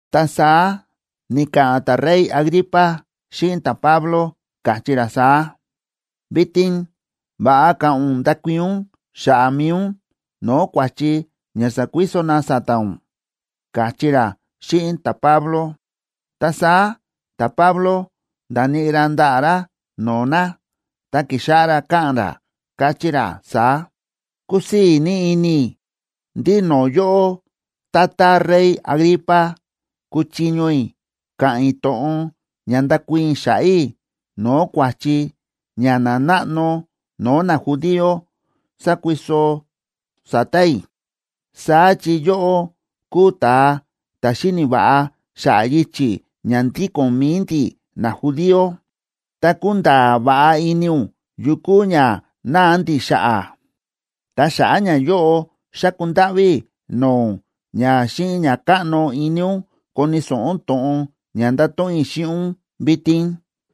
Ta saá ni̱ka̱ꞌa̱n ta̱rey Agripa xíꞌin ta̱Pablo, káchí ra saá: ―Vitin va̱ꞌa ka̱ꞌa̱n ún ndakuii̱n ún xa̱ꞌa̱ mi̱i ún no̱o̱ kua̱chi ña sákuiso na sa̱ta̱ ún ―káchí ra xíꞌin ta̱Pablo. Ta saá ta̱Pablo nda̱níꞌi ra ndaꞌa̱ ra no̱o̱ na, ta ki̱xáꞌá ra káꞌa̱n ra, káchí ra saá: ―Kúsii̱ ní ini i̱ ndí no̱o̱ yóꞌó, tata rey Agripa, kúchiño i̱ ka̱ꞌa̱n i̱ to̱ꞌon ña ndakuii̱n i̱ xa̱ꞌa̱ i̱ no̱o̱ kua̱chi ña nanáꞌno no̱o̱ najudío sákuiso sa̱ta̱ i̱. Saá chi yóꞌó kúu ta̱a ta̱ xíni̱ va̱ꞌa xa̱ꞌa̱ yichi̱ ña ndíko̱n mi̱i ndi̱ najudío, ta kúnda̱a̱ va̱ꞌa ini ún yu kúu ña náa ndi̱ xa̱ꞌa̱. Ta xa̱ꞌa̱ ñayóꞌo xáku ndáꞌví i̱ no̱o̱ ún ña xíꞌin ña káꞌno ini ún koni̱ so̱ꞌo ún to̱ꞌon ña ndato̱ꞌon i̱ xíꞌin ún vitin.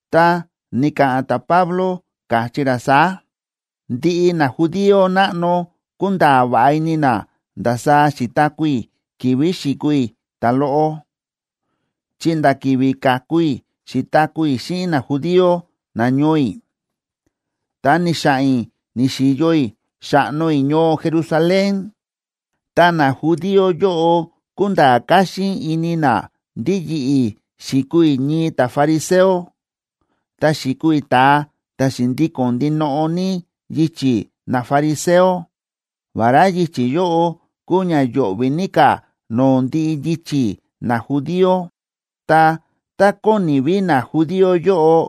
Ta ni̱ka̱ꞌa̱n ta̱Pablo, káchí ra saá: ―Ndiꞌi najudío náꞌno kúnda̱a̱ va̱ꞌa ini na ndasaá xi̱taku̱ i̱ ki̱vi̱ xi̱kuu i̱ ta̱loꞌo, chi nda̱ ki̱vi̱ ka̱ku i̱ xi̱taku̱ i̱ xíꞌin najudío nañoo i̱, ta ni̱xa̱ꞌa̱n i̱ ni̱xi̱yo i̱ xa̱ꞌno i̱ ñoo Jerusalén. Ta najudío yóꞌo kúnda̱a̱ káxín ini na ndí yi̱ꞌi̱ xi̱kuu i̱ ñii ta̱fariseo, ta xi̱kuu i̱ ta̱a ta̱ xi̱ndíko̱n ndinoꞌo ní yichi̱ nafariseo, vará yichi̱ yóꞌo kúu ña yo̱ꞌvi̱ ní ka̱ no̱o̱ ndiꞌi yichi̱ najudío. Ta tá kóni ví najudío yóꞌo,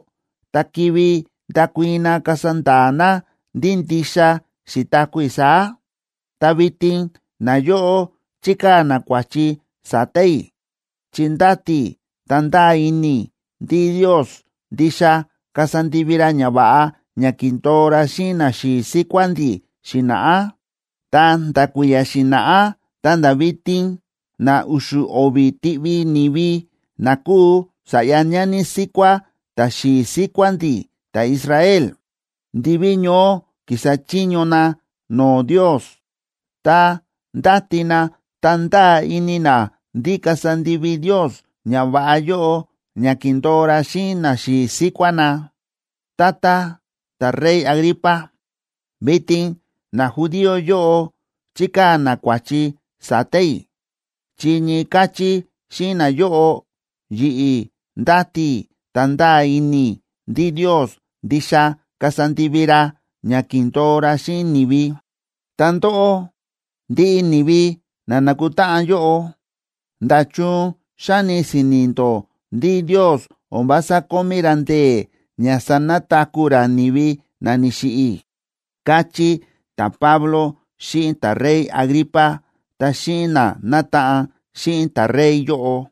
ta kivi ndakuii̱n na kasa nda̱a̱ na ndí ndixa xi̱taku̱ i̱ saá. Ta vitin nayóꞌo chíkaa̱ na kua̱chi sa̱ta̱ i̱ chi ndáti i̱ ta ndáa ini i̱ ndí Ndios ndixa kasa ndivi ra ñava̱ꞌa ña ki̱ndo̱o ra xíꞌin naxi̱i̱ síkuá ndi̱ xi̱na̱ꞌá. Ta nda̱ kui̱ya̱ xi̱na̱ꞌá ta̱nda̱ vitin na u̱xu̱ o̱vi̱ tiꞌvi ni̱vi na kúu sa̱ꞌya ñani síkuá ta̱xi̱i̱ síkuá ndi̱ ta̱Israel, ndiví ñoó kísa chiño na no̱o̱ Ndios, ta ndáti na ta ndáa ini na ndí kasa ndivi Ndios ñava̱ꞌa yóꞌo ña ki̱ndo̱o ra xíꞌin naxi̱i̱ síkuá na. Tata ta̱rey Agripa, vitin najudío yóꞌo chíkaa̱ na kua̱chi sa̱ta̱ i̱ chi ñii káchí xíꞌin nayóꞌo, yi̱ꞌi̱ ndáti i̱ ta ndáa ini i̱ ndí Ndios ndixa kasa ndivi ra ña ki̱ndo̱o ra xíꞌin ni̱vi. Ta ndóꞌó, ndiꞌi ni̱vi na nákutáꞌan yóꞌo, ¿nda̱chun xáni si̱ni̱ ndó ndí Ndios o̱n vása kómí ra ndee̱ ña sanataku̱ ra ni̱vi na ni̱xiꞌi̱? ―káchí ta̱Pablo xíꞌin ta̱rey Agripa ta xíꞌin na nátaꞌan xíꞌin ta̱rey yóꞌo.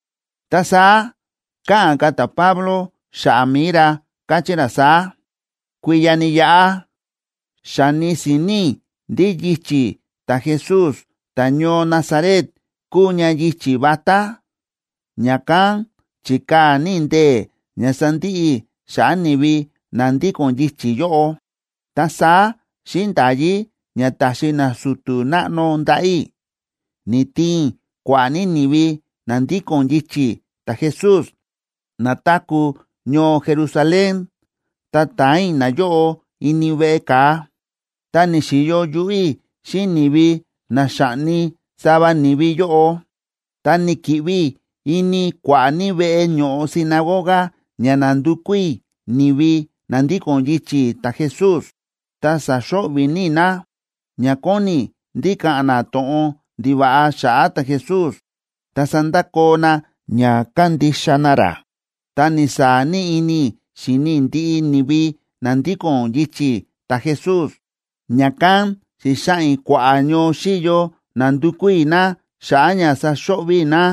Ta saá káꞌa̱n ka̱ ta̱Pablo xa̱ꞌa̱ mi̱i ra, káchí ra saá: ―Kui̱ya̱ ni̱yaꞌa, xa̱ni si̱ni̱ i̱ ndí yichi̱ ta̱Jesús ta̱ñoo Nazaret kúu ña yichi̱ vatá, ña̱kán chi̱kaa̱ ní i̱ ndee̱ ña sandiꞌi i̱ xa̱ꞌa̱ ni̱vi na ndíko̱n yichi̱ yóꞌo. Ta saá xíꞌin nda̱yí ña ta̱xi nasu̱tu̱ náꞌno ndaꞌa̱ i̱, ni̱tiin i̱ kua̱ꞌa̱ ní ni̱vi na ndíko̱n yichi̱ ta̱Jesús na táku̱ ñoo Jerusalén ta ta̱an i̱ nayóꞌo ini veꞌe ka̱a. Ta ni̱xi̱yo yuꞌú i̱ xíꞌin ni̱vi na xa̱ꞌni sava ni̱vi yóꞌo. Ta ni̱ki̱ꞌvi i̱ ini kua̱ꞌa̱ ní veꞌe ño̱ꞌo sinagoga ña nandukú i̱ ni̱vi na ndíko̱n yichi̱ ta̱Jesús, ta sa̱xo̱ꞌvi̱ ní i̱ na, ña kóni i̱ ndí ka̱ꞌa̱n na to̱ꞌon ndiva̱ꞌa xa̱ꞌa̱ ta̱Jesús ta sandakoo na ña kándixa na ra. Ta ni̱saa̱ ní ini i̱ xi̱ni i̱ ndiꞌi ni̱vi na ndíko̱n yichi̱ ta̱Jesús, ña̱kán xi̱xaꞌa̱n i̱ kua̱ꞌa̱ ñoo xíyo nándukú i̱ na xa̱ꞌa̱ ña saxo̱ꞌvi̱ i̱ na.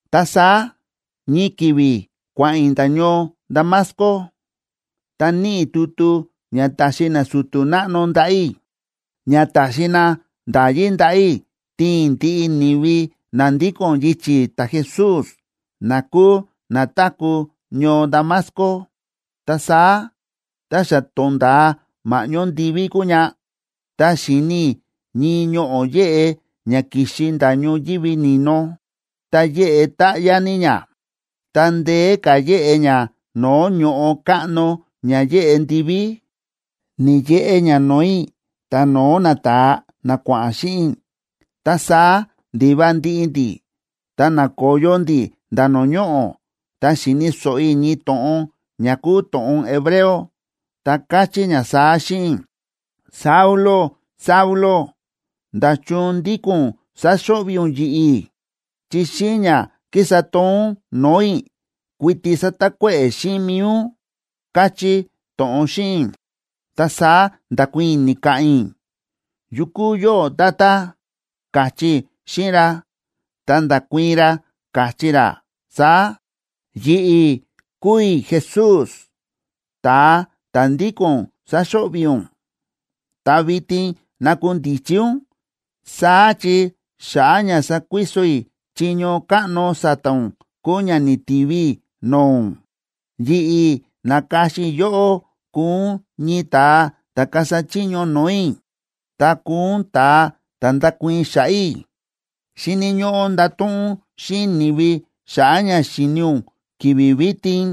’Ta saá ñii ki̱vi̱ kua̱ꞌa̱n i̱ nda̱ ñoo Damasco, ta níꞌi i̱ tutu ña ta̱xi nasu̱tu̱ náꞌno ndaꞌa̱ i̱, ña ta̱xi na nda̱yí ndaꞌa̱ i̱ tiin i̱ ndiꞌi ni̱vi na ndíko̱n yichi̱ ta̱Jesús na kúu na táku̱ ñoo Damasco. Ta saá tá xa to̱nda̱a ma̱ꞌñó ndiví kúu ña, ta xi̱ni i̱ ñii ñoꞌo̱ yéꞌe ña ki̱xi nda̱ ñoyívi ni̱no, ta yéꞌe táꞌyá ní ña, ta ndeé ka̱ yéꞌe ña no̱o̱ ño̱ꞌo káꞌno ña yéꞌe ndiví, ni̱yeꞌe ña no̱o̱ i̱ ta no̱o̱ nata̱a na kua̱ꞌa̱n xíꞌin i̱. Ta saá ndi̱va ndiꞌi ndi̱, ta na̱koyo ndi̱ nda̱ no̱o̱ ñoꞌo̱. Ta xi̱ni̱ so̱ꞌo i̱ ñii to̱ꞌon ña kúu to̱ꞌon hebreo, ta káchí ña saá xíꞌin i̱: “Saulo, Saulo, ¿nda̱chun ndíko̱n ún sáxo̱ꞌvi̱ ún yi̱ꞌi̱? Chi xíꞌin ña kísa toon ún no̱o̱ i̱, kuiti sátakuéꞌe̱ xíꞌin mi̱i ún”, káchí to̱ꞌon xíꞌin i̱.”a Ta saá nda̱kuii̱n i̱, ni̱ka̱ꞌa̱n i̱: “¿Yu kúu yóꞌó, Tata?”, káchí i̱ xíꞌin ra. Ta nda̱kuii̱n ra, káchí ra saá: “Yi̱ꞌi̱ kúu i̱ Jesús, ta̱a ta̱ ndíko̱n ún sáxo̱ꞌvi̱ ún. Ta vitin nakundichi ún, saá chi xa̱ꞌa̱ ña sakuiso i̱ chiño káꞌno sa̱ta̱ ún kúu ña ni̱tivi i̱ no̱o̱ ún. Yi̱ꞌi̱ na̱ka̱xin i̱ yóꞌó kuu ún ñii ta̱a ta̱ kasa chiño no̱o̱ i̱, ta kuu ún ta̱a ta̱ ndakuii̱n xa̱ꞌa̱ i̱. Xíni̱ ñóꞌó ndato̱ꞌon ún xíꞌin ni̱vi xa̱ꞌa̱ ña xi̱ni ún ki̱vi̱ vitin,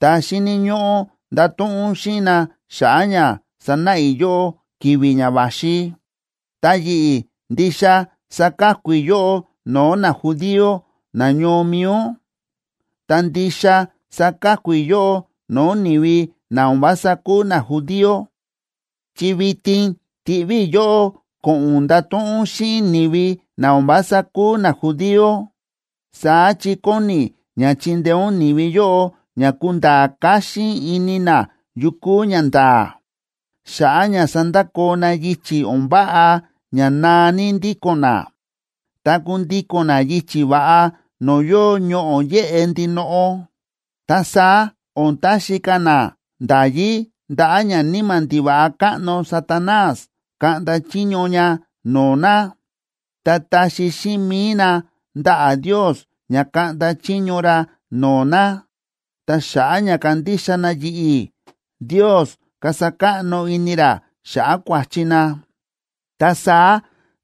ta xíni̱ ñóꞌó ndato̱ꞌon ún xíꞌin na xa̱ꞌa̱ ña sanáꞌa i̱ yóꞌó ki̱vi̱ ña va̱xi. Ta yi̱ꞌi̱ ndixa saka̱ku i̱ yóꞌó no̱o̱ najudío nañoo mi̱i ún, ta ndixa saka̱ku i̱ yóꞌó no̱o̱ ni̱vi na o̱n vása kúu najudío, chi vitin tíꞌví i̱ yóꞌó ko̱ꞌo̱n ún ndato̱ꞌon ún xíꞌin ni̱vi na o̱n vása kúu najudío. Saá chi kóni i̱ ña chindeé ún ni̱vi yóꞌo ña kunda̱a̱ káxín ini na yu kúu ñanda̱a̱, xa̱ꞌa̱ ña sandakoo na yichi̱ o̱n váꞌa ña naa ní ndíko̱n na, ta kundíko̱n na yichi̱ va̱ꞌa no̱o̱ yóo ñoꞌo̱ yéꞌe ndinoꞌo. Ta saá o̱n taxi ka̱ na nda̱yí ndaꞌa̱ ñaníma̱ ndiva̱ꞌa káꞌno Satanás kaꞌnda chiño ña no̱o̱ na, ta taxi xíꞌin mi̱i na ndaꞌa̱ Ndios ña kaꞌnda chiño ra no̱o̱ na. Ta xa̱ꞌa̱ ña kandixa na yi̱ꞌi̱, Ndios kasa káꞌno ini ra xa̱ꞌa̱ kua̱chi na, ta saá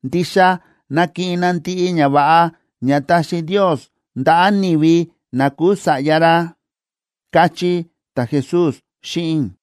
ndixa nakiꞌin na ndiꞌi ñava̱ꞌa ña taxi Ndios ndaꞌa̱ ni̱vi na kúu sa̱ꞌya ra”, káchí ta̱Jesús xíꞌin i̱.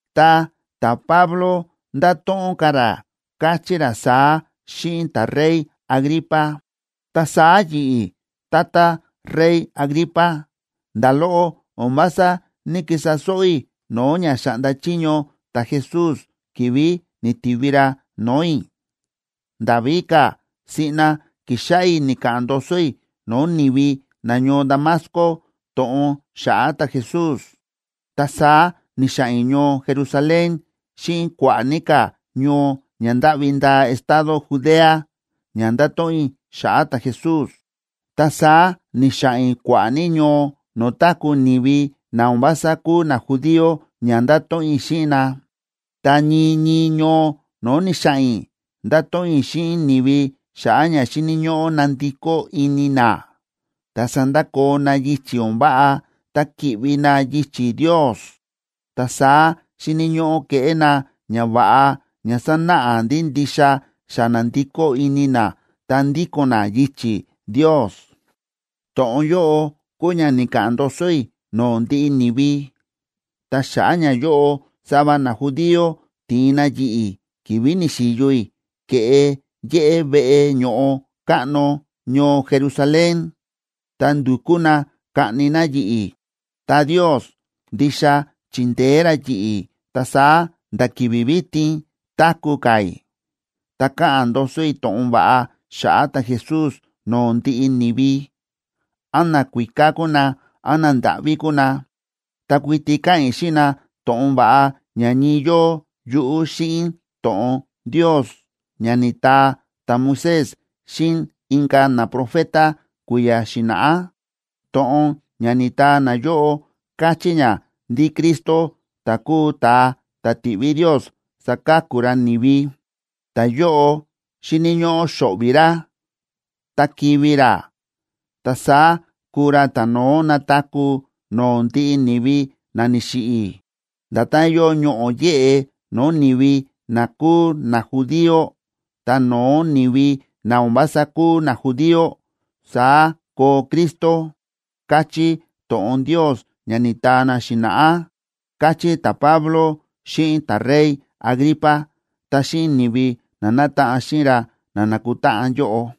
Ta ta̱Pablo nda̱to̱ꞌon ka̱ ra, káchí ra saá xíꞌin ta̱rey Agripa: ―Ta saá yi̱ꞌi̱, tata rey Agripa, nda̱ loꞌo o̱n vása ní‑kisa sóꞌó i̱ no̱o̱ ña xa̱ꞌnda chiño ta̱Jesús ki̱vi̱ ni̱tivi ra no̱o̱ i̱. Nda̱ víka̱, siꞌna ki̱xáꞌá i̱ ni̱ka̱ꞌa̱n ndoso i̱ no̱o̱ ni̱vi nañoo Damasco to̱ꞌon xa̱ꞌa̱ ta̱Jesús. Ta saá ni̱xa̱ꞌa̱n i̱ ñoo Jerusalén xíꞌin kua̱ꞌa̱ ní ka̱ ñoo ña ndáꞌvi ndaa estado Judea ña ndato̱ꞌon i̱ xa̱ꞌa̱ ta̱Jesús. Ta saá ni̱xa̱ꞌa̱n i̱ kua̱ꞌa̱ ní ñoo no̱o̱ táku̱ ni̱vi na o̱n vása kúu najudío ña ndato̱ꞌon i̱ xíꞌin na. Ta ñii ñii ñoo no̱o̱ ni̱xa̱ꞌa̱n i̱, nda̱to̱ꞌon i̱ xíꞌin ni̱vi xa̱ꞌa̱ ña xíni̱ ñóꞌó nandikó ini na, ta sandakoo na yichi̱ o̱n váꞌa, ta ki̱ꞌvi na yichi̱ Ndios. Ta saá xíni̱ ñóꞌó keꞌé na ñava̱ꞌa ña sanáꞌa ndí ndixa xa na̱ndikó ini na ta ndíko̱n na yichi̱ Ndios. To̱ꞌon yóꞌo kúu ña ni̱ka̱ꞌa̱n ndoso i̱ no̱o̱ ndiꞌi ni̱vi, ta xa̱ꞌa̱ ñayóꞌo sava najudío ti̱in na yi̱ꞌi̱ ki̱vi̱ ni̱xi̱yo i̱ ke̱ꞌe yéꞌé veꞌe ño̱ꞌo káꞌno ñoo Jerusalén, ta ndu̱kú na kaꞌni na yi̱ꞌi̱. Ta Ndios ndixa chi̱ndeé ra yi̱ꞌi̱, ta saá nda̱ ki̱vi̱ vitin táku̱ ka̱ i̱, ta káꞌa̱n ndoso i̱ to̱ꞌon va̱ꞌa xa̱ꞌa̱ ta̱Jesús no̱o̱ ndiꞌi ni̱vi. Án nakuíká kúu na, án nandáꞌví kúu na, ta kuiti káꞌa̱n i̱ xíꞌin na to̱ꞌon va̱ꞌa ña ñii yóo yuꞌú xíꞌin to̱ꞌon Ndios ña ni̱taa ta̱Moisés xíꞌin inka̱ naprofeta kui̱ya̱ xi̱na̱ꞌá. To̱ꞌon ña ni̱taa nayóꞌo káchí ña ndí Cristo ta̱ kúu ta̱a ta̱ tiꞌví Ndios saka̱ku ra ni̱vi, ta̱yóꞌo xíni̱ ñóꞌó xo̱ꞌvi̱ ra, ta kivi̱ ra. Ta saá kuu ra ta̱no̱ó nataku̱ no̱o̱ ndiꞌi ni̱vi na ni̱xiꞌi̱. Nda̱tán yóo ñoꞌo̱ yéꞌe no̱o̱ ni̱vi na kúu najudío ta no̱o̱ ni̱vi na o̱n vása kúu najudío, saá koo Cristo, káchí to̱ꞌon Ndios ña ni̱taa na xi̱na̱ꞌá ―káchí ta̱Pablo xíꞌin ta̱rey Agripa ta xíꞌin ni̱vi na nátaꞌan xíꞌin ra na nákutáꞌan yóꞌo.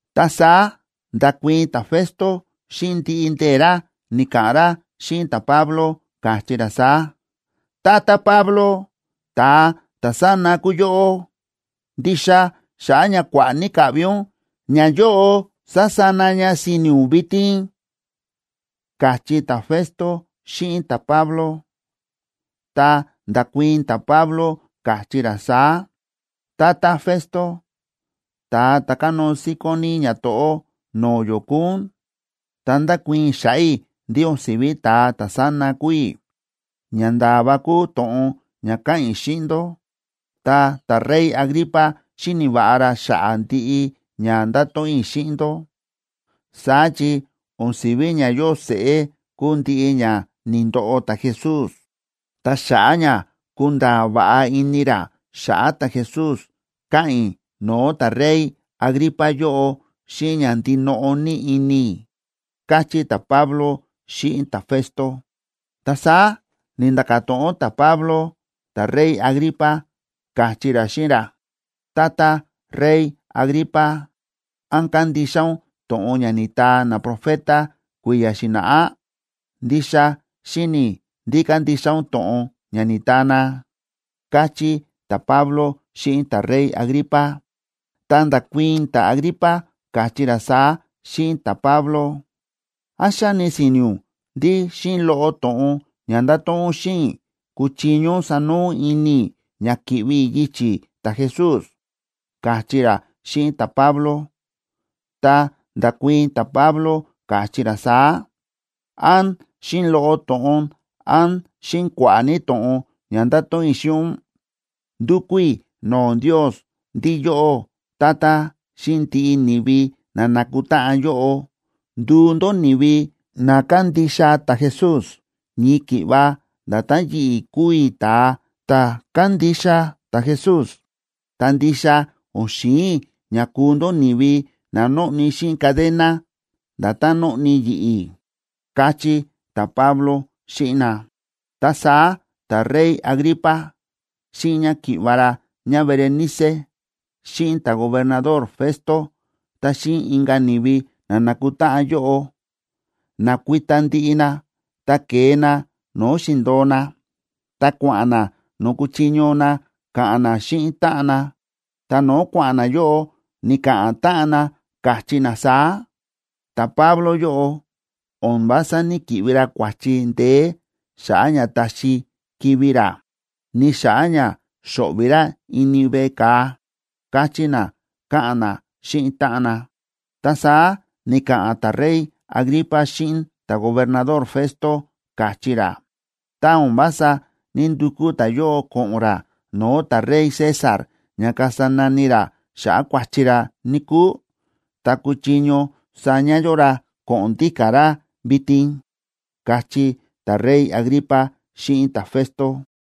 Ta saá nda̱kuii̱n ta̱Festo, xíꞌin ndiꞌi ndee̱ ra ni̱ka̱ꞌa̱n ra xíꞌin ta̱Pablo, káchí ra saá: ―Tata Pablo, ¡ta̱a ta̱sána kúu yóꞌó! Ndixa xa̱ꞌa̱ ña kua̱ꞌa̱ ní ka̱ꞌvi ún, ñayóꞌo sa̱sana ña si̱ni̱ ún vitin ―káchí ta̱Festo xíꞌin ta̱Pablo. Ta nda̱kuii̱n ta̱Pablo, káchí ra saá: ―Tata Festo, ta̱a ta̱ kánóo síkón ní ñato̱ꞌó no̱o̱ yó kúu ún, ta ndákuii̱n i̱ xa̱ꞌa̱ i̱ ndí o̱n si̱ví ta̱a ta̱sána kúu i̱. Ñanda̱a̱ va kúu to̱ꞌon ña káꞌa̱n i̱ xíꞌin ndó. Ta ta̱rey Agripa xíni̱ va̱ꞌa ra xa̱ꞌa̱ ndiꞌi ña nda̱to̱ꞌon i̱ xíꞌin ndó. Saá chi o̱n si̱ví ña yóo seꞌé kúu ndiꞌi ña ni̱ndoꞌo ta̱Jesús. Ta xa̱ꞌa̱ ña kúnda̱a̱ va̱ꞌa ini ra xa̱ꞌa̱ ta̱Jesús, káꞌa̱n i̱ no̱o̱ ta̱rey Agripa yóꞌo xíꞌin ña ndinoꞌo ní ini i̱ ―káchí ta̱Pablo xíꞌin ta̱Festo. Ta saá ni̱nda̱ka̱ to̱ꞌon ta̱Pablo ta̱rey Agripa, káchí ra xíꞌin ra: ―Tata rey Agripa, ¿án kándixa ún to̱ꞌon ña ni̱taa naprofeta kui̱ya̱ xi̱na̱ꞌá? Ndixa xíni̱ i̱ ndí kándixa ún to̱ꞌon ña ni̱taa na ―káchí ta̱Pablo xíꞌin ta̱rey Agripa. Ta nda̱kuii̱n ta̱Agripa, káchí ra saá xíꞌin ta̱Pablo: ―¿Án xáni si̱ni̱ ún ndí xíꞌin loꞌo to̱ꞌon ña nda̱to̱ꞌon ún xíꞌin i̱ kúchiño ún sanoo ún ini i̱ ña ki̱ꞌvi i̱ yichi̱ ta̱Jesús? ―káchí ra xíꞌin ta̱Pablo. Ta nda̱kuii̱n ta̱Pablo, káchí ra saá: ―Án xíꞌin loꞌo to̱ꞌon án xíꞌin kua̱ꞌa̱ ní to̱ꞌon ña ndato̱ꞌon i̱ xíꞌin ún, ndúkú i̱ no̱o̱ Ndios ndí yóꞌó, tata, xíꞌin ndiꞌi ni̱vi na na̱kutáꞌan yóꞌo, nduu ndó ni̱vi na kándixa ta̱Jesús ñii ki̱ꞌva nda̱tán yi̱ꞌi̱ kúu i̱ ta̱a ta̱ kándixa ta̱Jesús. Ta ndixa o̱n xi̱in i̱ ña kuu ndó ni̱vi na nóꞌni xíꞌin cadena, nda̱tán nóꞌni yi̱ꞌi̱ ―káchí ta̱Pablo xíꞌin na. Ta saá ta̱rey Agripa, xíꞌin ñáki̱ꞌva̱ ra ñáBerenice, xíꞌin ta̱gobernador Festo, ta xíꞌin inka̱ ni̱vi na na̱kutáꞌan yóꞌo, na̱kuita ndiꞌi na, ta ke̱e na no̱o̱ xi̱ndo̱o na, ta kua̱ꞌa̱n na no̱o̱ kúchiño na ka̱ꞌa̱n na xíꞌin táꞌan na. Ta no̱o̱ kua̱ꞌa̱n na yóꞌo, ni̱ka̱ꞌa̱n táꞌan na, káchí na saá: ―Ta̱Pablo yóꞌo o̱n vása ní‑kiꞌvi ra kua̱chi ndeé xa̱ꞌa̱ ña taxi kivi̱ ra, ni xa̱ꞌa̱ ña xo̱ꞌvi̱ ra ini veꞌe ka̱a ―káchí na, káꞌa̱n na xíꞌin táꞌan na. Ta saá ni̱ka̱ꞌa̱n ta̱rey Agripa xíꞌin ta̱gobernador Festo, káchí ra: ―Tá o̱n vása ní‑ndukú ta̱yóꞌo ko̱ꞌo̱n ra no̱o̱ ta̱rey César ña kasa nani ra xa̱ꞌa̱ kua̱chi ra, níkúu, ta kuchiño saña yó ra ko̱ꞌo̱n ndíka̱ ra vitin ―káchí ta̱rey Agripa xíꞌin ta̱Festo.